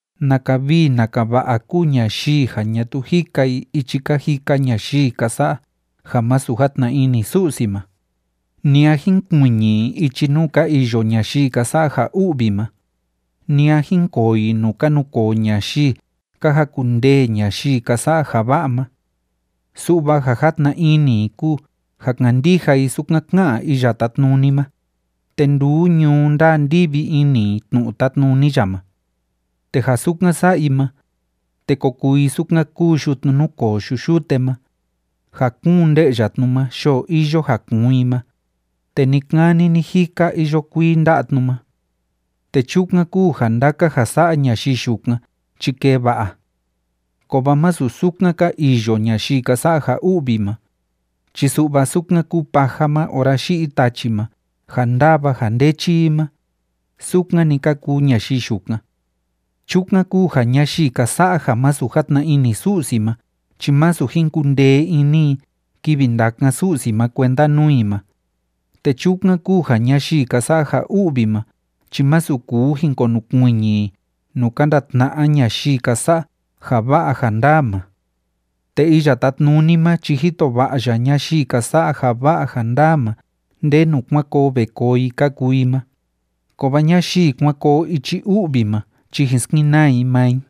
¡Naka vii naka va'a kúu ñayii ja ñatuu jika i ichi ka jika ñayii ka sa'a ja masu játna ini Su'si ma, ni a jínkuiñi i ichi nuu ka iyo ñayii ka sa'a ja u'vi ma, ni a jínkoo i nuu ka nukoo ñayii ka jakundee ñayii ka sa'a ja va'a ma! Su'va ja játna ini i kúu ja kandija i sukan ká'an Iya Tátnuni ma, te nduu ñuu ndáa ndívi ini i tnu'u tátnuni ya ma. Te ja sukan sa'a i ma, te ko kuu i sukan kúu yutnu núkoo yu'u yute ma, ja kúun nde'ya tnu ma yoo iyo ja kuun i ma, te ni‑kani ni‑jika iyo kuii nda'a tnu ma. Te chukan kúu ja ndaka ja sa'a ñayii yukan chi kee va'a. Kovaa masu sukan ka iyo ñayii ka sa'a ja u'vi ma, chi su'va sukan kúu paja ma ora yi'i tachi ma ja ndáva ja ndéchi i ma, sukan‑ni ka kuu ñayii yukan. Chukan kúu ja ñayii ka sa'a ja masu játna ini Su'si ma chi masu jin kundee ini i kivi ndakan Su'si ma kuenda nuu i ma, te chukan kúu ja ñayii ka sa'a ja u'vi ma chi masu kuu jin konukuiñi i nuu ka ndatna'a ñayii ka sa'a ja va'a ja ndaa ma. Te Iya Tátnuni ma chi jito va'a ya ñayii ka sa'a ja va'a ja ndaa ma ndenu kuan koo ve koo i ka kuu i ma, kovaa ñayii kuan koo ichi u'vi ma chi jin skenaa i maa i.